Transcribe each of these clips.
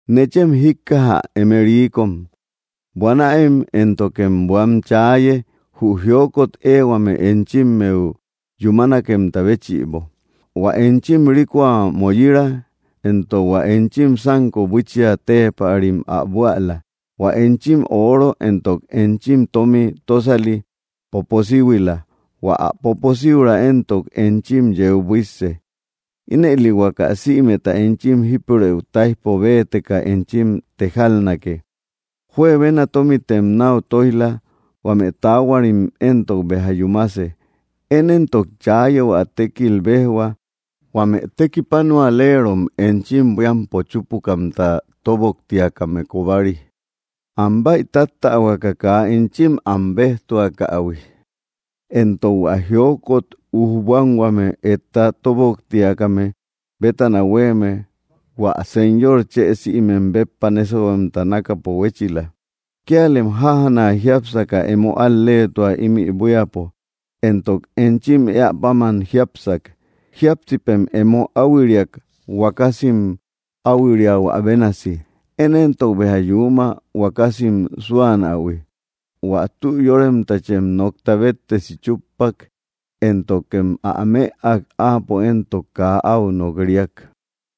¡Nechem jíkkaja, eme riikom! Buanäem, éntokem buan chaaye, jü jiokot éehuame enchimmeu yúmanekemta béchïbo. Huä enchim rikoa moyira, entok hua enchim sánko buiichia téepärim ä buäla. Huä enchim ooro entok enchim tómi tósali poposíhuila; hua ä poposíuraa éntok enchim yeu buísse. Ínëli huaka sïmeta enchim jípurëu táijpo béeteka enchim tejalnake. Juebena tómitem náu tóij‑la; huame taahuarim éntok béja yúmase. Én éntok chaaye, hua tékil béjhua, huame tekipanualeerom enchim buíampo chúpukamta tóboktiakame kobari, am bäitattähuaka kaa enchim am béjtuakähui; éntok hua jiokot ujbuanhuame etta tóboktiakame bétana huéeme hua Señor chë sïmem béppa nésahuemta nákapo huéchila. Kíalem jájana jiápsaka, emo al‑leetua ímï buíapo, entok enchim éä páman jiápsak. Jíapsipem emo áuhuiriak, huakasim áuhuiriahuä bénasi. Én éntok béja yuuma, huakasim súanähui. Huä tü yóremtachem nokta béttesi chúppak, éntokem ä mëak; áapo éntok kaa áu nok‑riak.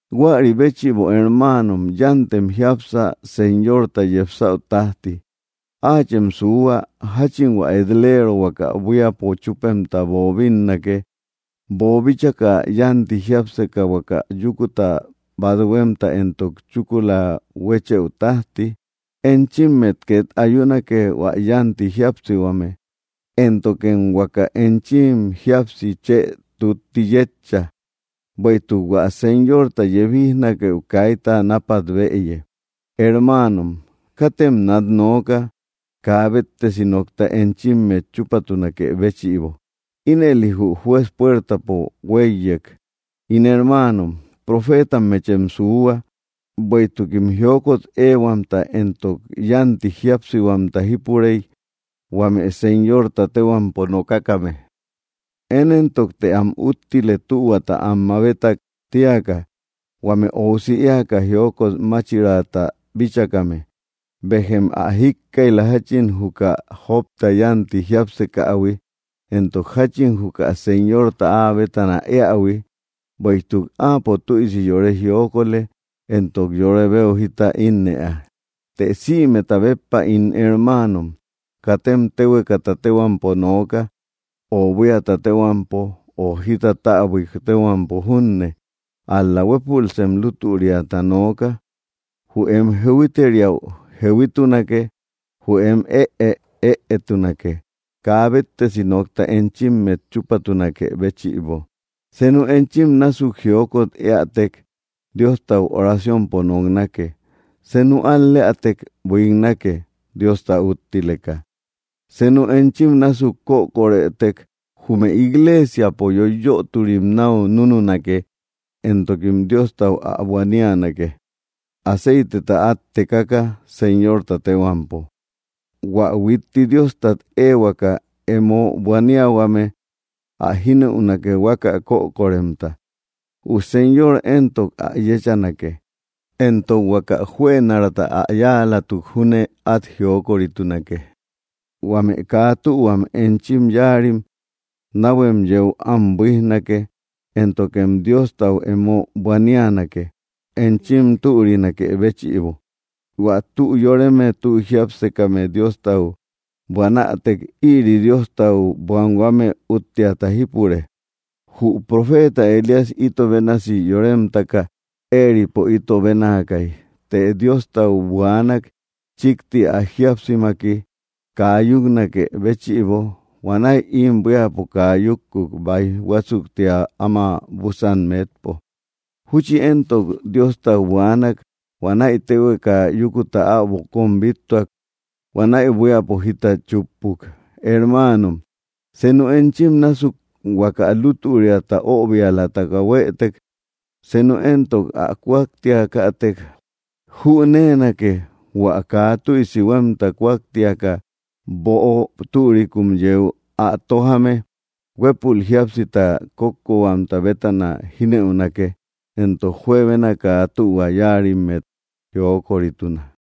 Huäri béchïbo, hermaanom, yántem jiápsa, Señorta yepsäu tájti. Áachem suuhua, jáchin hua et‑leero huaka buíapo chúpemta boobinnake, boobíchaka yánti jiápseka huaka yúkuta bathuemta éntok chúkula huéchëu tájti. Enchimmet két ayunake, hua yánti jíapsihuame, éntokem huaka enchim jíapsi chë tutti yétcha; bueïtuk hua Señorta yebijnakeu kaita nápat bëye. Hermaanom, katem nat nooka, kaa béttesi nokta enchimmet chúpatunakë béchïbo; ínëli jü Juez puertapo huéiyek. In hermaanom, profeetammechem suuhua, bueïtukim jiokot éehuamta éntok yánti jíapsihuamta jipurey, huame Señorta téhuampo nokakame. Én éntok, të am úttile, tühuata am mabetak tíaka, huame óusi éaka jiokot máchiraata bíchakame. Béjem ä jíkkaij‑la, jáchin juka Jobta yánti jiápsekähui, éntok jáchin juka Señorta áa bétana éähui; bueïtuk Áapo tüisi yore jiokolë, éntok yore beu jita ínnëa. Të sïmeta béppa, ín hermaanom, katem téhuekata téhuampo nooka, o buíata téhuampo, o jita täbuik téhuampo junne. Ál‑la huépulsem lútüriata nooka: jü em “jehuiteria”, jehuituake; jü em “ëe”, ëetunake, kaa béttesi nokta enchimmet chúpatunakë béchïbo. Senu enchim násuk jiokot éätek, Diostau oraciompo noknake. Senu al‑leätek, buiknake, Diosta úttileka. Senu enchim násuk kökorëtek, jume igleesiapo yoiyöturim náu núnunake; éntokim Diostau ä buanianake, aceiteta át tekaka, Señorta téhuampo. Huä huitti Diostat éehuaka emo buaniahuame ä jínëunake, huaka kökoremta. Jü Señor éntok ä yéchanake, entok huaka juënaraata ä yáalatuk júne át jiokoritunake. Huame kaa tühuam enchim yáarim, náhuem yeu am buíjnake, éntokem Diostau emo buanianake, enchim türinakë béchïbo. Huä tü yóreme tü jiápsekame Diostau buanätek, ïri Diostau buanhuame útteata jípure. Jü profeta Elías ito bénasi yóremtaka, éeripo ito bénaakay. Të Diostau buaanak, chíkti ä jíapsimaki, kaa yúknakë béchïbo. Huanäi ím buíapo kaa yúkkuk, báij huásuktia áma búsan metpo. Júchi éntok Diostau buaanak; huanäi téhueka yúkuta äbo kóm bíttuak. Huanäi buíapo jita chúppuk. Hermaanom, senu enchim násuk huaka lútüriata öbialataka huëtek, senu éntok ä kúaktiakätek, jüneenake: hua kaa tüisi huémta kúaktiaka böo türikun yeu ä tójame, huépul jíapsita kókkohuamta bétana jínëunake, éntok juebena kaa tühua yáarimmet jiokorituna.